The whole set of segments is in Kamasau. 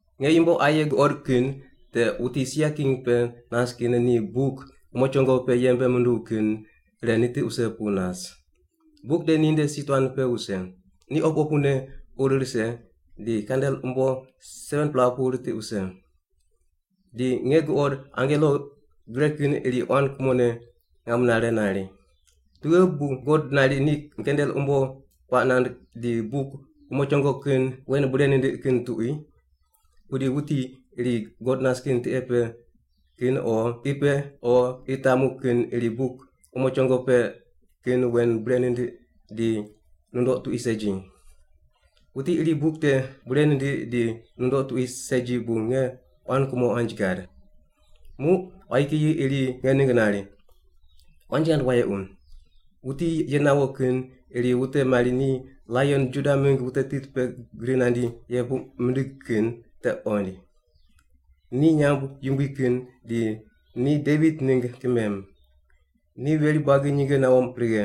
Nge yumbo aye guqod kin te wuti sia king pe nas kin ni buk umo chongo pe yembe munduw kin ire nitiq wuse pu nas. Buk te ninde si tuan pe wuse, ni opu opune ur rise di kandel umbo 7-pela pu ritiq wuse. Di nge guqod angelo gre kin iri quan kumone ngam nare nari, “Tughe bu God nari ni kandel umbo puaq nand di buk umo chongo kin wen bure nindiq kin tuqui?” Pudi wuti iri God nas kin tiqe pe kin o qi pe o qi tamu kin iri buk umo chongo pe kin wen bure nindiq di nundoq tuqui segi. Wuti iri buk te bure nindiq di nundoq tuqui segi bu nge quan kumo quanji gad. Muq quayi kiyi iri nge ningg nari, “Quanji ghand wayequ. Wuti ye nawo kin iri wute mari ni Laion Juda mingg wute tit pe gri nandi ye puq mindig kin te qoind. Ni nyamb yumbui kin di ni Devit ningg kimem. Ni veri buagi nyinge nawo righe.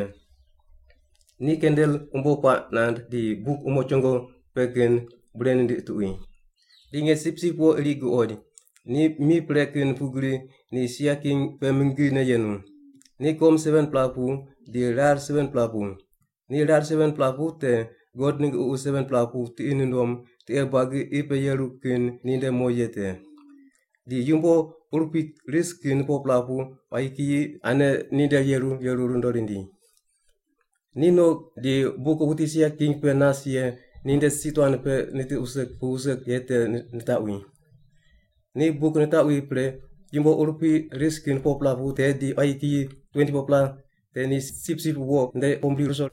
Ni kandel umbo puaq nand di buk umo chongo pe kin bure nindiq tuqui.” Di nge Sipsip Wo iri guqoid, ni mi pre kin pugri di ni sia king pe mingine yenu. Ni kom 7-pela pu di rar 7-pela pu. Ni rar 7-pela pu te God ningg ququ 7-pela pu tiqi nundom tiqe buagi qi pe yeru kin ninde mo ye te. Di yumbo urupui ris kin 4-pela pu quayi kiyi ane ninde yeru yeru rundo rindi. Ni no di buk wuti sia king pe nas ye ninde si tuan pe nitiq wuse pu wuse ye te nitaqwi. Ni buk nitaqwi pre yumbo urupui ris kin 4-pela te di quayi kiyi 24-pela te ni Sipsip Wo nde pombri ruso.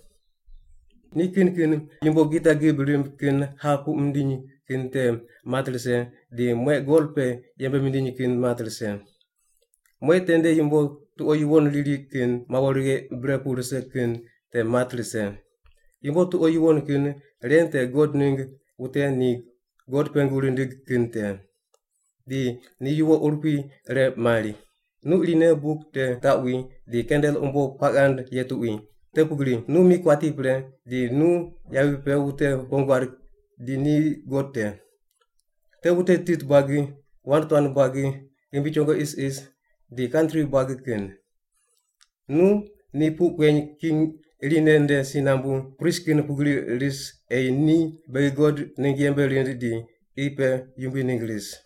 Ni kin kin yumbo gita gib rimb kin hap puq mindiny kin te mat rise di mueq gol pe yembe mindiny kin mat rise. Mueq tende yumbo tuqo yuwon riri kin mawo righe bre pu rise kin te mat rise. Yumbo tuqo yuwon kin ren te God ningg wute ni God pengu rindig kin te. Di ni yuwo urupui ire mari, “Nu irine buk te taqwi di kandel umbo puaq ghand ye tuqui, te pugri nu mi kuati pre di nu yavi pe wute wong guad di ni God te. Te wute tit buagi, wand tuan buagi, ghimbi chongo isis, di kantri buagi kin. Nu ni puq kueny king irine nde si nambu prist kin pugri ris ei ni beghi God ningg yembe rind di qi pe yumbui ningg ris.”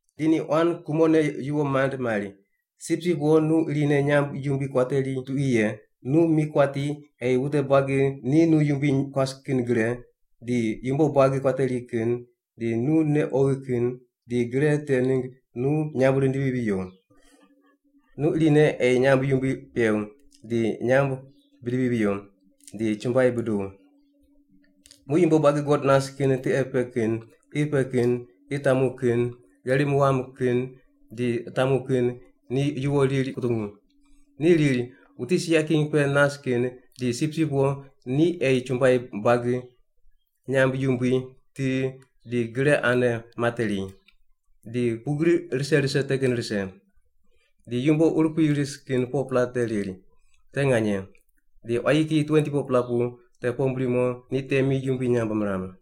Di ni quan kumone yuwo mand mari, “Sipsip Wo nu irine nyamb yumbui kuateri tuqui ye, nu mi kuati ei wute buagi ni nu yumbui kuas kin gre, di yumbo buagi kuateri kin, di nu nei oghi kin, di gre te ningg nu nyamb rindivi viyo. Nu irine ei nyamb yumbui pew, di nyamb bidivi viyo, di chumbuai buduw.” Muq yumbo buagi God nas kin tiqe pe kin, qi pe kin, qi tamu kin, gherim wam kin di tamu kin ni yuwo riri kutungu. Ni riri, “Wuti sia king pe nas kin di Sipsip Wo ni ei chumbuai buagi, nyamb yumbui, ti, di gre ane materi. Di pugri rise rise te kin rise.” Di yumbo urupui ris kin 4-pela te riri, “Te nganye.” Di quayi kiyi 24-pela pu te pombri mo ni temi yumbui nyamb miram.